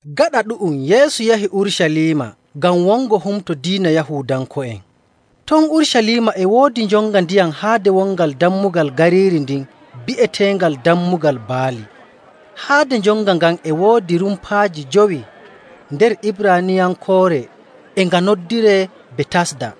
Gaɗa ɗu'um Yeesu yahi Urucaliima ngam wongo humto diina Yahuudanko'en. Ton Urucaliima e woodi njonga ndiyam haade wongal dammugal gariiri ndin bi'eteengal Dammugal Baali. Haade njonga ngan e woodi rumpaaji jowi. Nder Ibraaniyankoore e nga noddiree Betasda.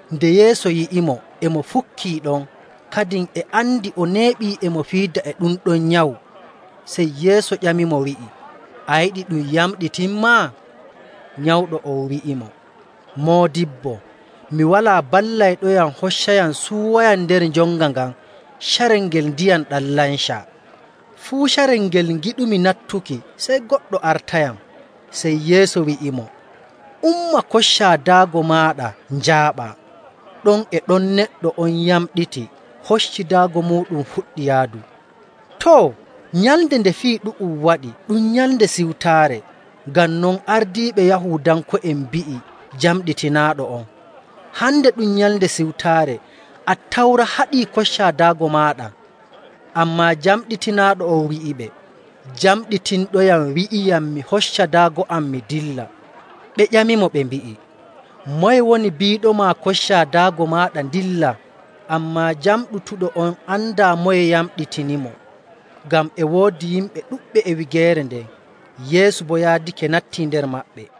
Nde Yeesu yi'imo e mo fukkii ɗon, kadin e andi o neeɓii e mo fiida e ɗum ɗon nyawu, sey Yeesu ƴamimo wi'i, “A yiɗi ɗum yamɗitinmaa?” Nyawɗo on wi'imo, “Moodibbo, mi walaa ballayɗoyam hoccayam suuwayam nder njonga ngan carel ngel ndiyam ɗam lancaa. Fuu carel ngel ngiɗumi nattuki, sey goɗɗo artayam.” Sey Yeesu wi'imo, “Umma koccaa daago maaɗa, njaaɓaa.” Ɗon e ɗon neɗɗo on yamɗiti, hocci daago muuɗum, fuɗɗi yaadu. Too, nyalnde nde fii ɗu'um waɗi ɗum Nyalnde Siwtaare. Ngam non, ardiiɓe Yahuudanko'en mbi'i jamɗitinaaɗo on, “Hande ɗum Nyalnde Siwtaare, Attawra haɗii koccaa daago maaɗa.”. Ammaa jamɗitinaaɗo on wi'iɓe, “Jamɗitinɗoyam wi'iyam mi hoccaa daago am mi ndillaa.” Ɓe ƴamimo ɓe mbi'i, “Moye woni biiɗoma koccaa daago maaɗa ndillaa?” Ammaa jamɗutuɗo on andaa moye yamɗitinimo, ngam e woodi yimɓe ɗuɗɓe e wigeere nden; Yeesu boo yaadake nattii nder maɓɓe.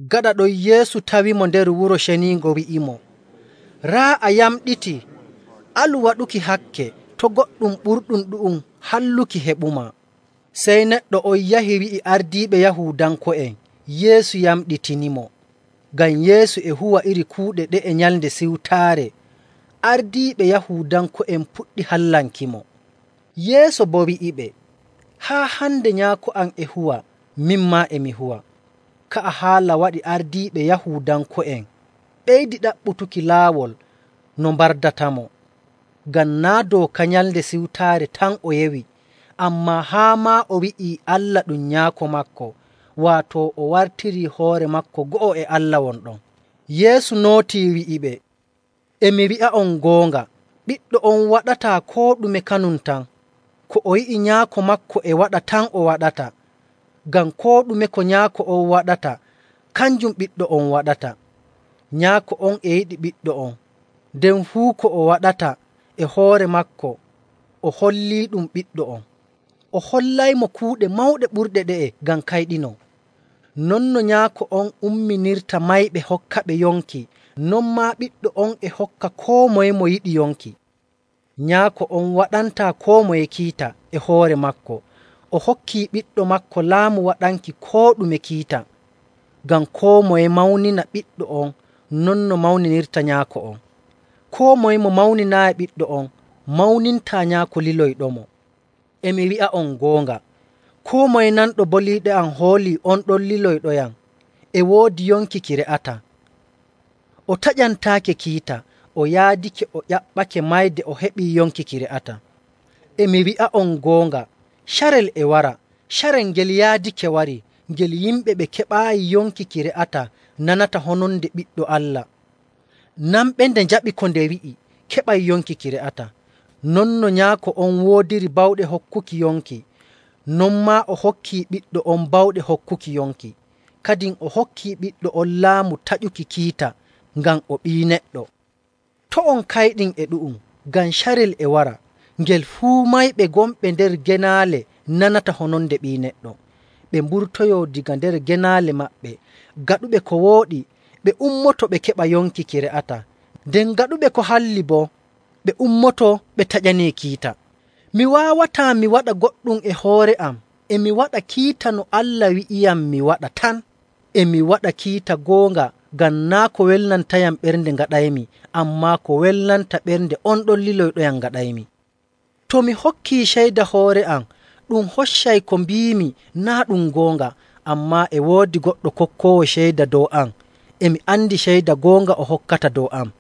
Gaɗa non Yeesu tawimo nder Wuro Ceniingo wi'imo, “Raa, a yamɗitii! Alu waɗuki hakke to' goɗɗum ɓurɗum ɗu'um halluki heɓumaa.” Sey neɗɗo on yahi wi'i ardiiɓe Yahuudanko'en Yeesu yamɗitinimo. Ngam Yeesu e huwa iri kuuɗe ɗe'e Nyalnde Siwtaare, ardiiɓe Yahuudanko'en puɗɗi hallankimo. Yeesu boo wi'iɓe, “Haa hande Nyaako am e huwa, min maa e mi huwa.” Ka'a haala waɗi ardiiɓe Yahuudanko'en ɓeydi ɗaɓɓutuki laawol no mbardatamo. Ngam naa' dooka Nyalnde Siwtaare tan o yewi, ammaa haa maa o wi'ii Allah ɗum Nyaako maako, waato o wartirii hoore maako go'o e Allah won ɗon. Yeesu nootii wi'iɓe, “E mi wi'a'on goonga, Ɓiɗɗo on waɗataa koo ɗume kanum tan, ko o yi'i Nyaako maako e waɗa tan o waɗata, ngam koo ɗume ko Nyaako on waɗata, kanjum ɓiɗɗo on waɗata. Nyaako on e yiɗi Ɓiɗɗo on, nden fuu ko o waɗata e hoore maako o holliiɗum Ɓiɗɗo on. O hollaymo kuuɗe mawɗe ɓurɗe ɗe'e ngam kayɗinon. Non no Nyaako on umminirta mayɓe hokkaɓe yonki, non maa Ɓiɗɗo on e hokka koo moye mo yiɗi yonki. Nyaako on waɗantaa koo moye kiita e hoore maako. O hokki Ɓiɗɗo maako laamu waɗanki koo ɗume kiita, ngam koo moye mawnina Ɓiɗɗo on non no mawninirta Nyaako on. Koo moye mo mawninaayi Ɓiɗɗo on mawnintaa Nyaako liloyɗomo. “E mi wi'a'on goonga, koo moye nanɗo boliiɗe am hoolii on ɗon liloyɗoyam e woodi yonki ki re'ataa, o taƴantaake kiita, o yaadake o ƴaɓɓake mayde o heɓii yonki ki re'ataa. E mi wi'a on goonga, carel e wara, carel ngel yaadake warii ngel yimɓe ɓe keɓaayi yonki ki re'ataa nanata hononde Ɓiɗɗo Allah. Nanɓe nde njaɓi koo nde wi'i keɓay yonki ki re'ataa. Non no Nyaako on woodiri bawɗe hokkuki yonki, non maa o hokkii Ɓiɗɗo on bawɗe hokkuki yonki. Kadin o hokkii Ɓiɗɗo on laamu taƴuki kiita, ngam o Ɓii Neɗɗo. To' on kayɗin e ɗu'um, ngam carel e wara ngel fuu mayɓe gonɓe nder genaale nanata hononde Ɓii Neɗɗo ɓe mburtoyoo daga nder genaale maɓɓe. Gaɗuɓe ko wooɗi ɓe ummoto ɓe keɓa yonki ki re'ataa, nden gaɗuɓe ko halli boo ɓe ummoto ɓe taƴanee kiita.. “Mi waawataa mi waɗa goɗɗum e hoore am, e mi waɗa kiita no Allah wi'iyam mi waɗa tan. E mi waɗa kiita goonga, ngam naa' ko welnantayam ɓernde ngaɗaymi, ammaa ko welnata ɓernde on ɗon lilɗoyam ngaɗaymi. “To mi hokkii ceyda hoore am, ɗum hoccay ko mbiimi naa' ɗum goonga. Ammaa e woodi goɗɗo kokkoowo ceyda dow am, e mi andi ceyda goonga o hokkata dow am.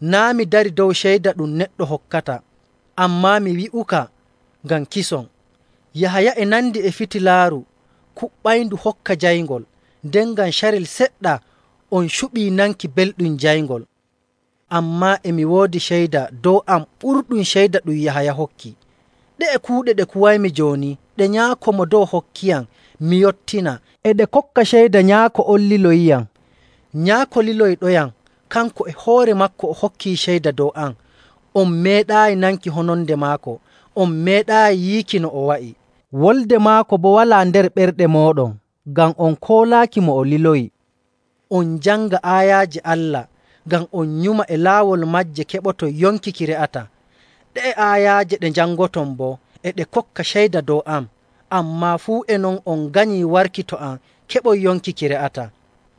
Naa' mi darii dow ceyda ɗum neɗɗo hokkata, ammaa mi wi'uka ngam kison. Yahaya e nandi e fitilaaru kuɓɓayndu hokka jayngol, nden ngam carel seɗɗa on cuɓii nanki belɗum jayngol. Ammaa e mi woodi ceyda dow am ɓurɗum ceyda ɗum Yahaya hokki. Ɗe'e kuuɗe ɗe kuwaymi jooni ɗe Nyaako Mo Dow hokkiyam mi yottina, e ɗe kokka ceyda Nyaako on liloyiyam. Nyaako liloyɗoyam, kanko e hoore maako o hokkii ceyda dow am. On meeɗaayi nanki hononde maako, on meeɗaayi yiiki no o wa'i.. Wolde maako boo walaa nder ɓerɗe mooɗon ngam on koolaaki mo o liloyi. On njanga aayaaje Allah ngam on nyuma e laawol maaje keɓoton yonki ki re'ataa. Ɗe'e aayaaje ɗe njangoton boo e ɗe kokka ceyda dow am. Ammaa fuu e non on nganyii warki to am keɓon yonki ki re'ataa.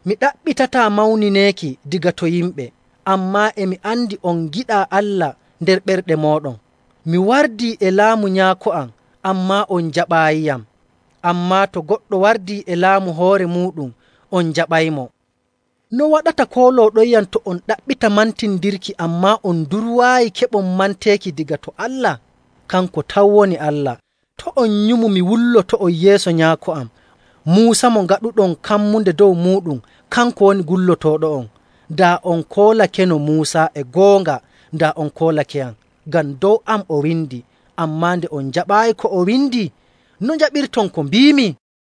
“Mi ɗaɓɓitataa mawnineeki daga to yimɓe. Ammaa e mi andi on ngiɗaa Allah nder ɓerɗe mooɗon. Mi wardii e laamu Nyaako am, ammaa on njaɓaayiyam. Ammaa to goɗɗo wardii e laamu hoore muuɗum, on njaɓaymo. No waɗata koolooɗonyam to on ɗaɓɓita mantindirki, ammaa on ndurwaayi keɓon manteeki daga to Allah? Kanko tan woni Allah. To' on nyumu mi wulloto'on yeeso Nyaako am. Muusa mo ngaɗuɗon kammunde dow muuɗum, kanko woni gullotooɗo'on. Daa on koolakeno Muusa e goonga, daa on koolakeyam, ngam dow am o windi. Ammaa nde on njaɓaayi ko o windi, no njaɓirton ko mbiimi?”